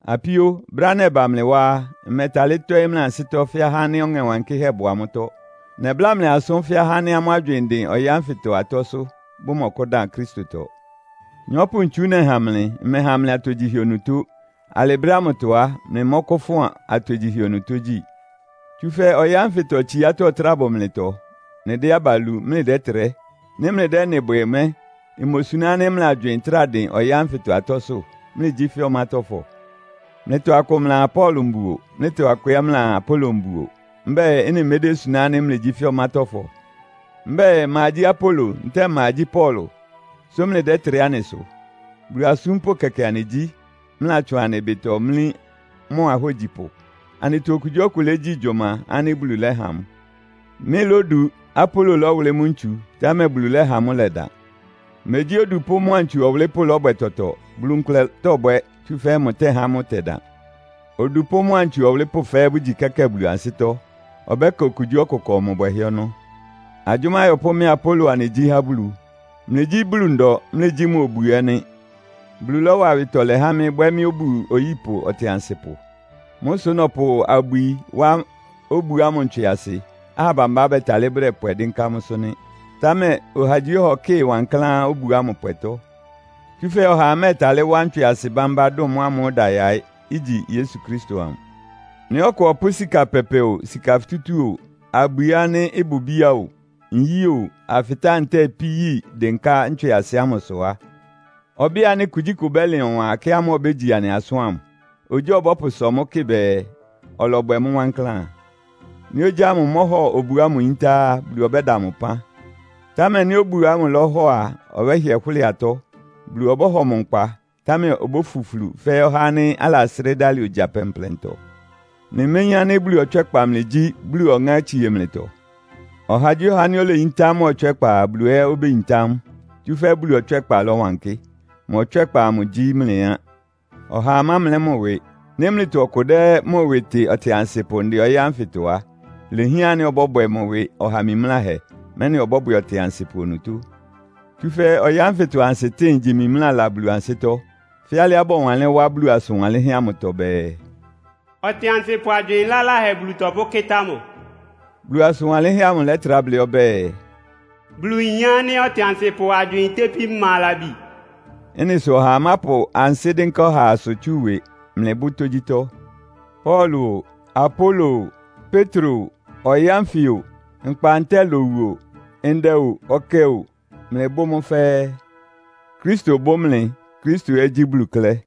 Apíó, brɛ́á nɛba mlɩ wá á, mmɛtalɩ́ tɔ́ɩ́ mlɩ ansɩ́tɔ́ fɛ́ ahá ánɩ́ Ɔŋɛ Wankɩ́hɛ́ bʋ amʋ́tɔ́. Nɛbláa mlɩ asʋ́n fɛ́ ahá ánɩ́ amʋ́ agywɩɩn ɩdɩn ɔyɩ́ ánfɩtɔ atɔ́sʋ́, bʋmɔkʋ́dan Kristotɔ. Nyɔ́pʋ-ntsu nɛha mlɩ. Mmɛha mlɩ atogyihɛ onutó. Alɩ brɛ́ ámʋtɔ á, mlɩmɔ́kʋ́fʋn atogyihɛ onutó gyí. Tsúfɛ́ ɔyɩ́ ánfɩtɔ tsiátɔ́ ɩtráa bʋ mlɩtɔ. Mlɩdɛ́ aba lu, mlɩdɛ́trɛ́. Nɩ́ mlɩdɛ́ ɩ́nɩ bwɛ mɛ́, imosuná ánɩ́ mlɩ agywɩɩn trá dɩn ɔyɩ́ ánfɩtɔ atɔ́sʋ́, mlɩgyí fɛ́ ɔmátɔ́fɔ? Mlɩtɔ akʋ mlɩaa, “Paulo mbuo.” Mlɩtɔ akʋ ɛ́ mlɩaa, “Apolo mbuo.” Mbɛ́ɛ, ɩ́nɩ medésuná ánɩ́ mlɩgyí fɛ́ ɔmátɔ́fɔ? Mbɛ́ɛ, ma gyí Apolo, ntɛ́ɛ ma gyí Paulo, sʋ́ mlɩdɛ́trɛ́ anɩ sʋ? Bulu asúmpʋ́ kɛkɛ anɩgyí, mlɩlatsʋn anɩ ɩbɩtɔ mlí mʋ ahógyipʋ. Anɩtɔ okugyíɔkʋ légyi gyʋma ánɩ́ Bulu lɛ́ha mʋ. Mɩ́lódu, Apolo lɔ́wʋlɩ́ mʋ́ ntsu, támɛ Bulu lɛ́ha mʋ́ ɩlɛdan. Megyí odupʋ́ mʋ́a ntsu ɔwʋlɩ́pʋ́ lɔ́bwɛ tɔtɔ. Bulu nkʋlɛ tɔ́bwɛ, tsúfɛ́ mʋtɛ́há mʋ́ ɩtɛdan. Odupʋ́ mʋ́a ntsu ɔwʋlɩ́pʋ́ fɛ́ɛ́ bʋgyi kɛ́kɛ́ɛ Bulu ansɩ́tɔ́, ɔbɛ́ka okugyíɔkʋ ɩkɔ mʋ bwɛhɛ́ ɔnɔ́. Agyʋ́má ayɔpʋ́ mɩ́a Apolo anɩgyí há Bulu. Mlɩgyí Bulu ndɔ, mlɩgyí mʋ obu ɛ́ nɩ́. Bulu lɔ́wa awɩtɔlɛ há mɩ́, bwɛ́ mɩ́ obu oyípʋ ɔtɩansɩpʋ. Mʋ́ sʋ́ nɔpʋ abwi wá obu ámʋ ntswɩasɩ, aha bambá bɛtalɩ́ bʋdɛpwɛ dɩ́nká mʋ́sʋ́ nɩ́. Támɛ ɔhagyíɔha ɔkɩ́ɩ wankláán obu ámʋ pwɛtɔ́. Tsúfɛ́ ɔhaa mɛ́ɛtalɩ́ wá ntswɩasɩ bámbá dʋn mʋ́ ámʋ́ʋ́ ɩda yaɩ́, igyi Yesu Kristo amʋ. Nɩ́ ɔkʋ ɔpʋ́ sika pɛpɛ o, sika futútú o, abwi ánɩ́ ɩbʋ bíá o, nyí o, afɩtáa ntɛ́ɛ ipí yi dɩ́nká ntswɩasɩ ámʋsʋ á, ɔbɩ́ɩ ánɩ́ kugyíkʋ ɩbɛ́lɩn ɔwan ɛkɛ ámʋ́ʋ́ Bulu obégyi anɩ asʋ́n ámʋ. Ogyá ɔbɔ́pʋsɔ mʋ́ kɩ bɛɛ, ɔlɔbwɛ mʋ́ wankláán. Nɩ́ ogyá ámʋ mɔhɔ obu ámʋ yíntá á, Bulu ɔbɛ́da mʋ ɩpán. Támɛ nɩ́ obu ámʋ lɔ́hɔ a, ɔbɛ́hɩɛ hʋ́lɩ atɔ́. Bulu ɔbɔ́hɔ mʋ nkpa, támɛ obófuflu fɛ́ ɔhá ánɩ́ alasrɩ́ dalɩ ogya plɛnplɛntɔ. Mlɩméyín ánɩ́ Bulu ɔtswɛ́kpa mlɩgyí, Bulu Ɔŋɛ́ ámʋ tsie mlɩtɔ? Ɔhagyíɔha ánɩ́ oleyintá mʋ ɔtswɛ́kpa a, Bulu ɛ́ obéyintá mʋ, tsúfɛ́ Bulu ɔtswɛ́kpa lɔwankɩ́. Mʋ ɔtswɛ́kpa amʋ gyí mlɩ á. Ɔhaa mámlɛ́ mʋ ɩwɩ! Nɩ́ mlɩtɔ ɔkʋ dɛ́ mʋ ɩwɩ tɩ ɔtɩansɩpʋ ndɛ ɔyɩ́ ánfɩtɔ á, ilehián ánɩ́ ɔbɔ́bwɛ mʋ ɩwɩ ɔha mimláhɛ, mɛ́nɩ ɔbɔ́bwɛ ɔtɩansɩpʋ onutó. Tsúfɛ́ ɔyɩ́ ánfɩtɔ ansɩtɩ́ɩn igyi mimlála Bulu ansɩ́tɔ́. Fɛ́ alɩá bɔwanlɩ́n wá Bulu asʋn wanlɩ́nhɛ́ amʋtɔ bɛɛ, “Ɔtɩansɩpʋ agywɩɩn laláhɛ Bulu tɔpʋ́kɩ́tá mʋ.” Bulu asʋn wanlɩ́nhɛ́ amʋ lɛtrá blɩ́ ɔbɛ́ɛ, “Bulu yin ánɩ́ ɔtɩansɩpʋ agywɩɩn itépí ma labi.” Ɩ́nɩ sʋ ɔhaa mápʋ ansɩ́ dɩ́nká ɔhaasʋ tsú ɩwɩ. Mlɩbʋ́ tógyítɔ́. Paulo o, Apolo o, Petro o, ɔyɩ́ ánfɩ o, nkpa ntɛ́ɛ lowu o, ndɛ o, ɔkɛ o, mlɩbʋ́ mʋ́ fɛ́ɛ́. Kristo bʋ́ mlɩ, Kristo ɛ́ gyí Bulu klɛ́.